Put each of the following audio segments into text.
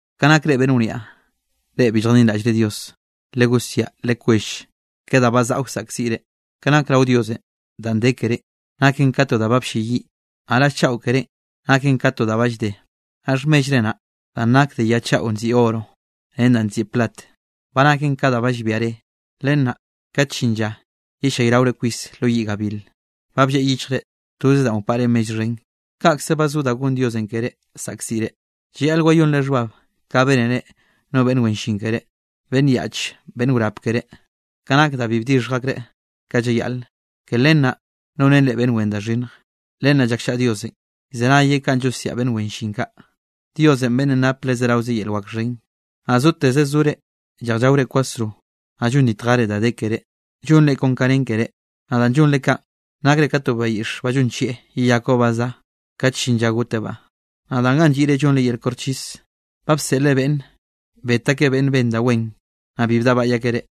Ka nak reꞌ beꞌnn wniaꞌ, reꞌ bi lljadinraꞌllre Diosenꞌ legosiaꞌ lekwell, ke da ba zaꞌa wsaꞌkziꞌ reꞌ. Ka nak rao Diosenꞌ danꞌ de kerénꞌ naken ka to da ba llbeyiꞌ, naꞌ raꞌll chaꞌo kerénꞌ naken ka to da ba llde. Naꞌ xhmellre naꞌ danꞌ nak de ya chaꞌo nziꞌi oro ren danꞌ nziꞌi plat, ba naken ka da ba llbia re. Len naꞌ kat llin lla yellayraore kwis lo yiꞌ gabil. Ba blleꞌ yichjre toze da wpaꞌre mell xhen, kaꞌkze ba zo da gon Diosenꞌ keré saꞌkziꞌre. Llayaꞌl wayonre xhbab ka bénere no beꞌnn wen llin keré, beꞌnn yaꞌch ben wrap keré. Ka nak da bi bdixhj akreꞌ ka llayaꞌle. Ke len naꞌ nonen reꞌ beꞌnn wen da xhinnj. Len naꞌ llakllaꞌa Diosenꞌ, llzenayeꞌ kanꞌ llosiaꞌ beꞌnn wen llin kaꞌ, Dios beꞌnnenꞌ nape le zerawe yel wak xhen. Naꞌ zotez zore lleꞌj llaore kwasro, naꞌ llonditjere da de keré llonre kon ka nen keré. Naꞌ danꞌ llonre kaꞌn, nakre ka to bayiꞌx ba llonchieꞌ yeyakbaꞌ ba za, kat llin lla gotebaꞌ. Naꞌ danꞌ ga lliꞌre llonre yel koxchis, ba bseꞌlre beꞌnn bet akeꞌ beꞌnn ben da wen, naꞌ bi bdaꞌbaꞌy akeꞌ reꞌ.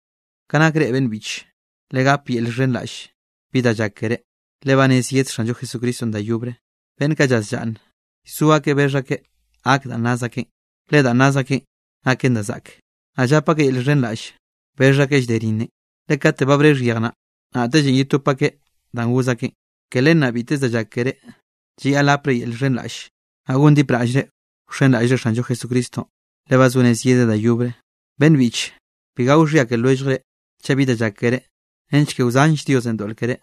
Ka nak reꞌ beꞌnn biꞌche, legap yel llxhenraꞌll bi da llak keré, le ba rez yed Xanllo Jesucristonꞌ da yobre. Beꞌnn kaꞌ llaz llaꞌnne, llzo akeꞌ bexh akeꞌ gak danꞌ naz akeꞌn, le danꞌ naz akenꞌ naken da zaꞌke. Naꞌ llap akeꞌ yel llxhenraꞌll bexh akeꞌ llde rinnenꞌ, le kate ba brexh yej naꞌ, naꞌtellenꞌ yetop akeꞌ danꞌ goz akeꞌn. Ke len naꞌn bitez da llak keré, llayaꞌl gapre yel llxhenraꞌlle, naꞌ gondipraꞌllre wxenraꞌllre Xanllo Jesucristonꞌ, le ba zo rez yedeꞌ da yobre. Beꞌnn biꞌche, bi gao xhia ke lwelljre chaꞌ bi danꞌ llak keré, nench ke wzanll Diosenꞌ doꞌl keré,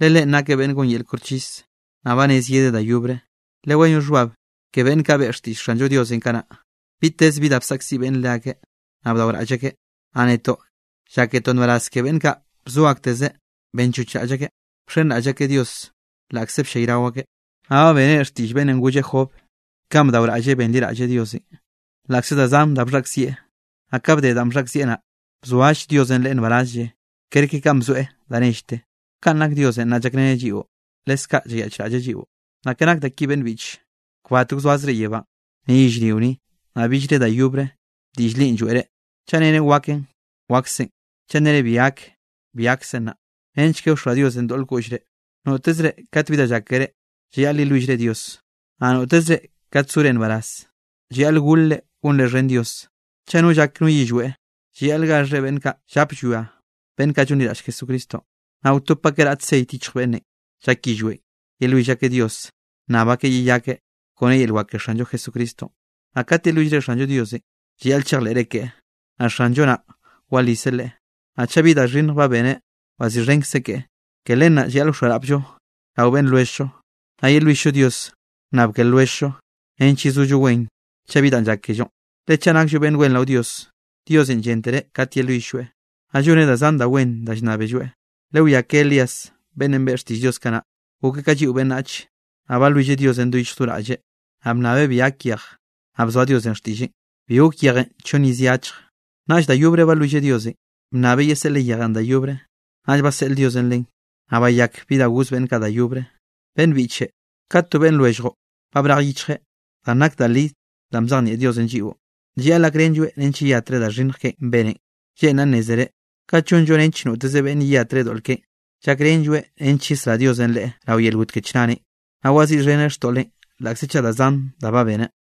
le Leꞌen nakeꞌ beꞌnn gon yel koxchis, naꞌ ba rez yedeꞌ da yobre. Lewayón xhbab ke beꞌnn kaꞌ beꞌe xtiꞌll Xanllo Diosenꞌ kanaꞌ. Bitez bi da bsaꞌkziꞌ beꞌnne leakeꞌ, naꞌ bdaoraꞌll akeꞌ. Naꞌ netoꞌ lláketoꞌ nbaraz ke beꞌnn kaꞌ bzo akteze benchochraꞌll akeꞌ, bxenraꞌll akeꞌ Dios laꞌkze bllayrao akeꞌ. Naꞌ ba bénere xtiꞌll beꞌnnenꞌ golle Job kanꞌ bdaoraꞌlleꞌ benliraꞌlleꞌ Diosenꞌ, laꞌkze da zan da bxhaꞌkzieꞌ. Naꞌ ka bde danꞌ bxhaꞌkzieꞌ naꞌ, bzoall Diosenꞌ leꞌe nbarazlle kerke kanꞌ bzoeꞌ da nellte. Kaꞌn nak Diosenꞌ naꞌ llakreneꞌ lliꞌo, leskaꞌ llayaꞌchraꞌlleꞌ lliꞌo. Naꞌ ke nake da ki beꞌnn biꞌche, kbat wzoazre yebánꞌ, ni yellrio ni, naꞌ billre da yobre diꞌll linꞌ lloeꞌre. Chaꞌ nnere waken, waksen; chaꞌ nere bi gak, bi gaksen naꞌ, nench ke wxoa Diosenꞌ doꞌl koꞌllre. Notezre kat bi da llak keré, llayaꞌl yelwillre Dios. Naꞌ notezre kat zore nbaraz, llayaꞌl golre gonre xhen Dios. Chaꞌ no llak no yillweꞌ, llayaꞌl gaxheꞌ beꞌnn kaꞌ llap llwia beꞌnn kaꞌ llonliraꞌll Jesucristonꞌ. Naꞌ wtop akeꞌ raꞌt ceit yichj beꞌnnenꞌ llak yillweꞌn, yelwill akeꞌ Dios nnab akeꞌ yeyakeꞌ kone yel wak ke Xanllo Jesucristonꞌ. Naꞌ kat yelwillre Xanllo Diosenꞌ, llayaꞌl chejleꞌre keꞌe, naꞌ Xanllo naꞌ waliseꞌ leꞌe; naꞌ chaꞌ bi da xhinnj ba beneꞌ, waziꞌxhenkzeꞌ keꞌe. Ke len naꞌ llayaꞌl wxoarapllo rao beꞌnn lwelljllo, naꞌ yelwill-llo Dios wnnab ke lwelljllo nench yezollo wen chaꞌ bi danꞌ llak kellonꞌ. Le chaꞌ nakllo beꞌnn wen rao Dios, Diosenꞌ lléntereꞌ kate yelwill-lloeꞌ, naꞌ lloneꞌ da zan da wen da llnnábelloeꞌ. Lewiá ke Elías beꞌnnenꞌ beꞌe xtiꞌll Dios kanaꞌ. Gokeꞌ ka lliꞌo beꞌnnach. Naꞌ balwilleꞌ Diosenꞌ do yichj do raꞌlleꞌ, naꞌ bnnabeꞌ bi gak yejw, naꞌ bzoa Diosenꞌ xtiꞌlleꞌ, bi gok yejenꞌ chonn iz ye achje. Naꞌll da yobre balwilleꞌ Diosenꞌ, bannabeꞌ yeseꞌleꞌ yejenꞌ da yobre, naꞌll baseꞌl Diosenꞌ len, naꞌ bayak bi da goz beꞌnn kaꞌ da yobre. Beꞌnn biꞌche, kat to beꞌnn lwelljllo ba brej yichjeꞌ danꞌ nak da li danꞌ bzejnieꞌ Diosenꞌ lliꞌo, llayaꞌl gakrenlloeꞌ nench yeyatreꞌ da xhinnj keꞌen beneꞌn. Lleꞌnraꞌ nnézere, kat llonllo nench noteze beꞌnne yeyatreꞌ doꞌl keꞌen, llakrenlloeꞌ nench yesrá Diosenꞌ leꞌe rao yel got ke chnarenꞌ. Naꞌ waziꞌxheneꞌ xtoꞌleꞌn laꞌkze chaꞌ da zan da ba beneꞌ.